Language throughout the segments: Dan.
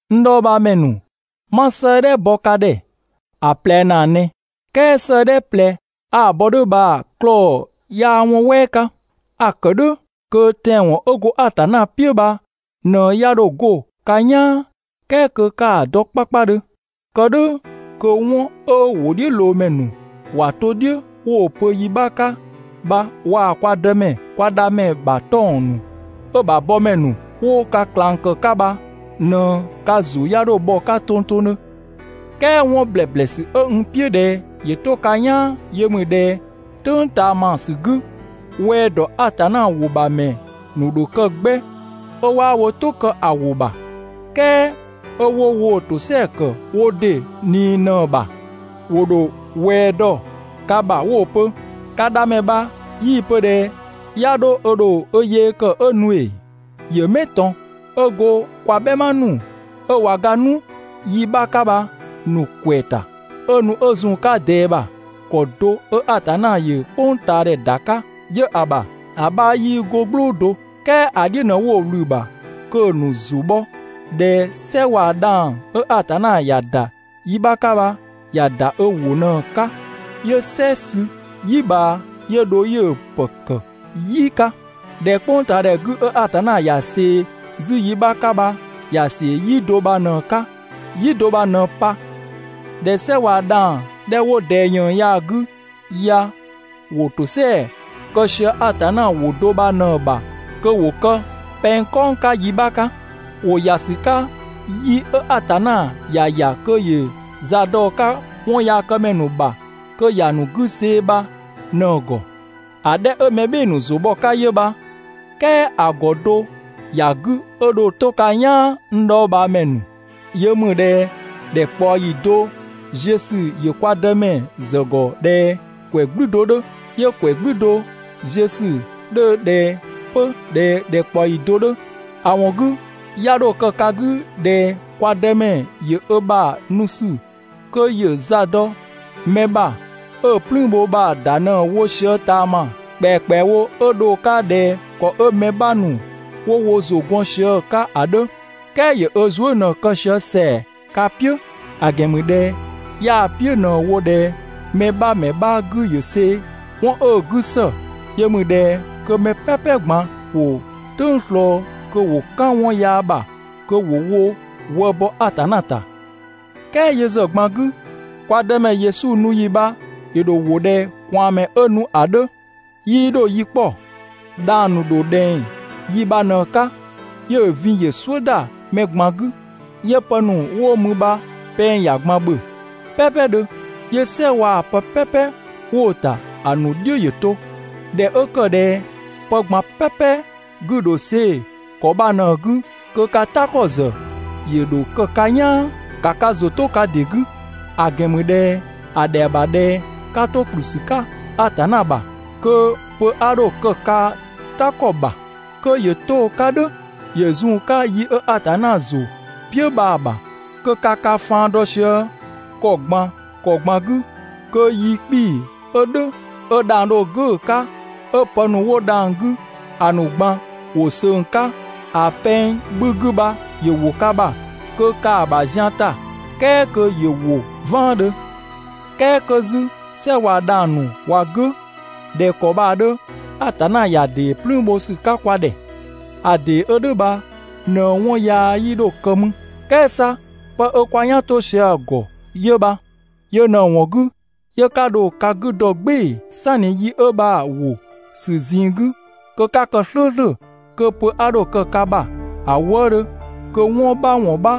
N dhɔɔbhaamɛ ‑nu, 'ma 'sëëdhɛ bo ka ꞊dhɛ ‑a ꞊plɛ ‑naa ꞊nɛ. "Kɛɛ 'sëëdhɛ ꞊plɛ 'a‑ bɔ "dhʋ̈ bha‑ 'bha 'klɔɔ‑ 'yaa 'wɔn "wɛɛ 'ka. A‑ ‑kë "dhʋ̈ kö tɛanwɔn 'ö go Atanna "piʋ̈ bha ꞊në 'ya 'dho 'go ka "yaan, "kɛɛ kö 'ka‑ dɔ 'kpakpadhö. Kë "dhʋ̈ kö 'wɔn 'ö‑ ‑wʋdhiʋ̈loomɛ ‑nu ‑wa to "dhiʋ̈ 'wo‑ pö yi 'bha 'ka bha waa‑ kwa Dëmɛ, kwa Dhamɛ ‑bha 'tɔng‑ ‑nu 'ö‑ ‑bha bɔmɛ ‑nu 'wo ka ꞊klang ‑kë 'ka bha ꞊në ka ‑zʋ 'ya 'dho bhɔ‑ 'ka tongtongdhö. "Kɛɛ 'wɔn ‑blɛblɛsü 'ö n "piʋ̈ ꞊dhɛ ‑yö 'to ka "yaan yö ‑mü ꞊dhɛ "tʋ̈ng ꞊taamasü 'gü, ꞊wɛɛ ‑dɔ Atanna ‑wɔn ‑bha ‑mɛ ‑nu ‑dho kë 'gbɛ, 'ö 'waa wo "tʋ kë ‑a ‑wʋ ‑bha, "kɛɛ 'ö 'wo woo‑ ‑tosɛa ‑kë wo ‑dɩ ꞊nii ꞊në‑ ‑bha. ‑Wo ‑dho ꞊wɛɛ dɔ ka ‑bha 'wo‑ pö: «Ka Dhamɛ bha 'yii‑ pö ꞊dhɛ 'ya 'dho ö ‑dho ö yee kë 'ö nu ‑ee? ‑Yö 'mɛ ꞊tɔn? 'Ö go kwa "bhɛma ‑nu 'ö ꞊wa ga 'nu yi 'bha 'ka bha‑ ‑nu ‑kwɛ ‑ta, 'ö nu 'ö zun‑ 'ka ꞊dɛɛ ‑bha, ‑kɔ do 'ö Atanna ‑yö "kpʋngtaadhɛ ‑da 'ka 'yö‑ ‑bha, ‑a 'bha 'yii 'go "gblʋʋ do.» "Kɛɛ ‑a "dhiʋ̈ ꞊në 'wo‑ ꞊wlü‑ ‑bha kö‑ ‑nu ‑zʋ bhɔ ꞊dhɛ "sɛ waa‑ dhang‑ 'ö Atanna ‑ya ‑da yi 'bha 'ka bha ‑ya ‑da ö ‑wʋ ꞊në‑ 'ka, 'yö "sɛ sü "yi ꞊bhaa 'yö dho 'yö‑ ‑pë ‑kë "yi 'ka. ꞊Dhɛ "kpʋngtaadhɛ 'gü 'ö Atanna ‑ya ꞊see 'zü yi 'bha 'ka bha ‑ya ‑see "yi do bha ꞊në‑ 'ka, "yi do bha ꞊në pa. ꞊Dhɛ "sɛ waa‑ dhang‑ 'dhɛ 'wo ꞊dɛɛ ‑yën ya‑ 'gü ya ‑wo ‑tosɛa kë sië Atanna ‑wʋ do bha ꞊në‑ ‑bha kö ‑wo kë pɛng "kɔng 'ka yi 'bha 'ka. ‑Wo ‑ya ‑sü 'ka yi 'ö Atanna ‑ya ‑ya kö ‑yö za dɔ‑ 'ka 'wɔnyaakëmɛ ‑nu ‑bha kö ‑ya ‑nu 'gü see‑ bha ꞊në‑ ‑gɔ. (‑A 'dhɛ 'ö mɛ "bhɩɩ‑ ‑nu ‑zʋ bhɔ‑ 'ka 'yö bha). "Kɛɛ ‑a ‑gɔ do ‑ya 'gü 'ö dho 'to ka "yaan n dhɔɔbhaamɛ ‑nu, yö ‑mü ꞊dhɛ ‑dhɛkpaɔyi do ziö ‑sü ‑yö kwa Dëmɛ ‑zë ‑gɔ ꞊dhɛ ‑kwɛ "gblü do 'dhö, 'yö ‑kwɛ "gblü do ziö ‑sü 'dhö ꞊dhɛ 'pö ꞊dhɛ ‑dhɛkpaɔyi do 'dhö. ‑A ‑wɔn 'gü, 'ya 'dho kë ka 'gü ꞊dhɛ kwa Dëmɛ ‑yö ö ‑bha nu ‑sü kö ‑yö za dɔ mɛ ‑bha 'ö‑ "plüün bho bha‑ ‑da ꞊në wo sië ꞊taama ‑kpɛakpɛawo 'ö dho‑ 'ka ꞊dhɛ ‑kɔ 'ö mɛ 'bha ‑nu 'wo wo ‑zʋ 'gɔn sië‑ 'ka ‑a 'dhö. "Kɛɛ ‑yö 'ö zuë" ꞊në‑ kë sië ‑sɛa ka "piʋ̈, ‑a ‑gɛn ‑mü ꞊dhɛ 'yaa‑ "piʋ̈ ꞊në‑ wo ꞊dhɛ mɛ 'bha ‑mɛ 'bha 'gü ‑yö see‑. 'Wɔn 'ö‑ 'gü ‑së, yö ‑mü ꞊dhɛ kö mɛ "pɛpɛ ꞊gban ‑wo "tʋng ꞊slɔɔ kö ‑wo "kan 'wɔn yaa ‑bha kö ‑wo wo wë bɔ Atanna ‑ta. "Kɛɛ yö ‑zë ꞊gban 'gü, kwa Dëmɛ Yesu nu ‑yi bha ‑yö ‑dho ‑wo ꞊dhɛ ꞊kwaanmɛ 'ö nu ‑a 'dhö, 'yii dho yi 'kpɔ. Dhang‑ ‑nu ‑dho ꞊dhɛng 'yi bha ꞊në‑ 'ka 'yö‑ vin ‑yö "suʋ̈ ‑da mɛ ꞊gban 'gü, 'yö pë ‑nu 'wo mü bha pɛng ‑ya ꞊gban ‑bhö "pɛɛpɛdhö, 'yö "sɛ waa‑ pë "pɛpɛ 'wo‑ ‑ta ‑a ‑nu "dhiʋ̈ ‑yö to. ꞊Dhɛ 'ö ‑kë ꞊dhɛ pë ꞊gban "pɛpɛ 'gü‑ ‑dho see‑ ‑kɔ bha ꞊në‑ 'gü, kö ka "ta ‑kɔ ‑zë ‑yö ‑dho kë ka "yaan. (‑Ka ka ‑zʋ 'to ka ‑dɩ 'gü, ‑a ‑gɛn ‑mü ꞊dhɛ) ‑a ‑dhɛa ‑bha ꞊dhɛ 'ka 'to ‑kplü ‑sü 'ka Atanna ‑bha, kö pö 'a 'dho kë ka "ta ‑kɔ ‑bha, kö ‑yö 'to‑ 'ka "dhʋ̈ ‑yö zun‑ 'ka yi 'ö Atanna ‑zʋ "piʋ̈ bha‑ ‑bha, kö ka ka faan dɔ sië ‑kɔ ꞊gban ‑kɔ ꞊gban 'gü kö yi 'kpii‑ 'ö "dhʋ̈, 'ö dhang‑ dho "gʋ̈‑ 'ka 'ö pë ‑nu 'wo dhang‑ 'gü ‑a ‑nu ꞊gban ‑wo ꞊söng‑ 'ka ‑a pɛng 'bhü 'gü bha ‑yö ‑wo ka ‑bha kö ka‑ ‑bha zian ‑ta, "kɛɛ kö ‑yö ‑wo "vaandhö. "Kɛɛ 'kö 'zü "sɛ waa‑ dhang‑ ‑nu ꞊wa "gʋ̈ ꞊dhɛ ‑kɔ bha‑ 'dhö, Atanna ‑ya ‑dee "plüün bho ‑sü 'ka kwa ‑dhɛ. ‑A ‑dee 'ö "dhʋ̈ bha ꞊në 'wɔn yaa 'yii 'dho kë mü. "Kɛɛ 'sa pë 'ö 'kwa "yan 'to sië‑ ‑gɔ 'yö bha. Yö ꞊në‑ ‑wɔn 'gü, 'yö 'ka dho ka 'gü dɔ "gbɩɩ‑, "sanni yi 'ö bha‑ ‑wo ‑sü ꞊zinng 'gü, kö 'ka kë "slʋ̈ʋ̈slʋ̈, kö pö 'a 'dho kë ka ‑bha ‑a wëëdhö, kö 'wɔn 'bha ‑wɔn 'bha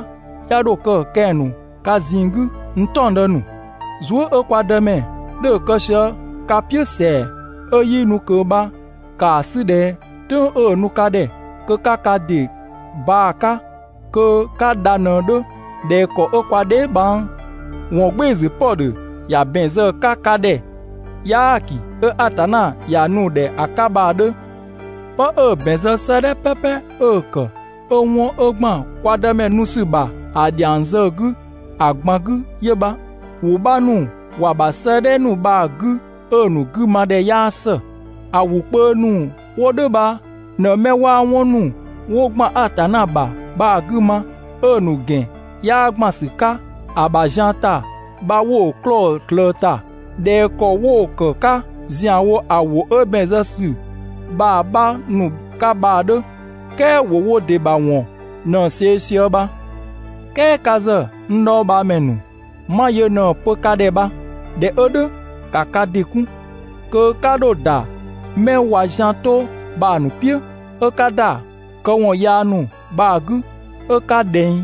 'ya 'dho kë kɛng‑ ‑nu ka ꞊zinng 'gü, n "taɔngdë ‑nu. Zuë" 'ö kwa Dëmɛ 'dhö‑ kë sië ka "piʋ̈ ‑sɛa ('ö 'yii nu ꞊kö) bha ‑kaa 'sü ꞊dhɛ "tʋ̈ng 'ö‑ nu ka ‑dhɛ kö 'ka ka ‑dɩ baa‑ 'ka kö 'ka dha ꞊në‑ 'dhö, ꞊dhɛ ‑kɔ 'ö kwa dheebhang ‑wɔngbɩɩsü Pɔdhö ‑ya ‑bɛn zë‑ 'ka ka ‑dhɛ "yaaki 'ö Atanna ‑ya nu‑ ‑dhɛ ‑a 'ka bha‑ 'dhö. 'Pë 'ö‑ ‑bɛn zë 'sëëdhɛ "pɛpɛ 'ö‑ ‑kë, 'ö 'wɔn 'ö ‑gban kwa Dëmɛ nu ‑sü ‑bha ‑a ‑dhiang zë‑ 'gü ‑a ꞊gban 'gü 'yö bha. ‑Wʋ 'bha ‑nu ‑wa ‑bha 'sëëdhɛ ‑nu bha‑ 'gü 'ö‑ ‑nu 'gümadhɛ 'yaa ‑së. ‑A ‑wʋ kpö ‑nu 'wo "dhʋ̈ bha ꞊në 'mɛ 'waa 'wɔn ‑nu 'wo ‑gban Atanna ‑bha bha‑ 'gü ma, 'ö‑ ‑nu ‑gɛn 'yaa ‑gban ‑sü 'ka‑ ‑bha zian ‑ta bha 'wo‑ 'klɔɔ‑ ꞊slëë‑ ‑ta ꞊dhɛ ‑kɔ 'wo‑ ‑kë 'ka ‑zianwo ‑a ‑wʋ 'ö ‑bɛn zë ‑sü bha‑ 'bha ‑nu 'ka bha‑ 'dhö. "Kɛɛ ‑wo wo ‑dɩ ‑bha ‑wɔn ꞊në‑ see‑ sië bha. "Kɛɛ ka ‑zë, n dhɔɔbhaamɛ ‑nu, 'ma yö ꞊në‑ pö ka ‑dhɛ bha. ꞊Dhɛ 'ö "dhʋ̈, ‑ka ka ‑dɩ 'kun, kö 'ka 'dho ‑da 'mɛ ꞊wa zian 'to bha‑ ‑nu "piʋ̈, 'ö 'ka ‑da këwɔn yaa ‑nu bha‑ 'gü 'ö ka ꞊dhɛng,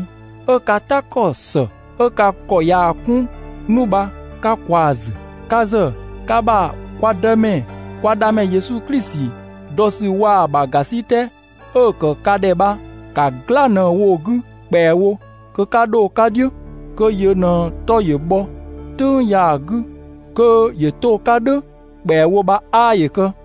'ö ka "ta ‑kɔ ‑së 'ö ka ‑kɔ ꞊yaa‑ 'kun 'nu bha 'ka ꞊kwaa‑ ‑zü. Ka ‑zë ka ‑bha kwa Dëmɛ kwa Dhamɛ Yesu Klisi dɔ ‑sü waa‑ ‑bha ‑gasitɛ 'ö‑ ‑kë ka ‑dhɛ bha ‑ka "gla ꞊në‑ wo‑ 'gü ‑kpɛawo kö 'ka 'dho‑ 'ka "dhiʋ̈. Kö yö ꞊në‑ 'tɔ ‑yö bhɔ "tʋ̈ng ya‑ 'gü kö ‑yö 'to‑ 'ka "dhʋ̈ ‑kpɛawo bha 'aa ‑yö kë.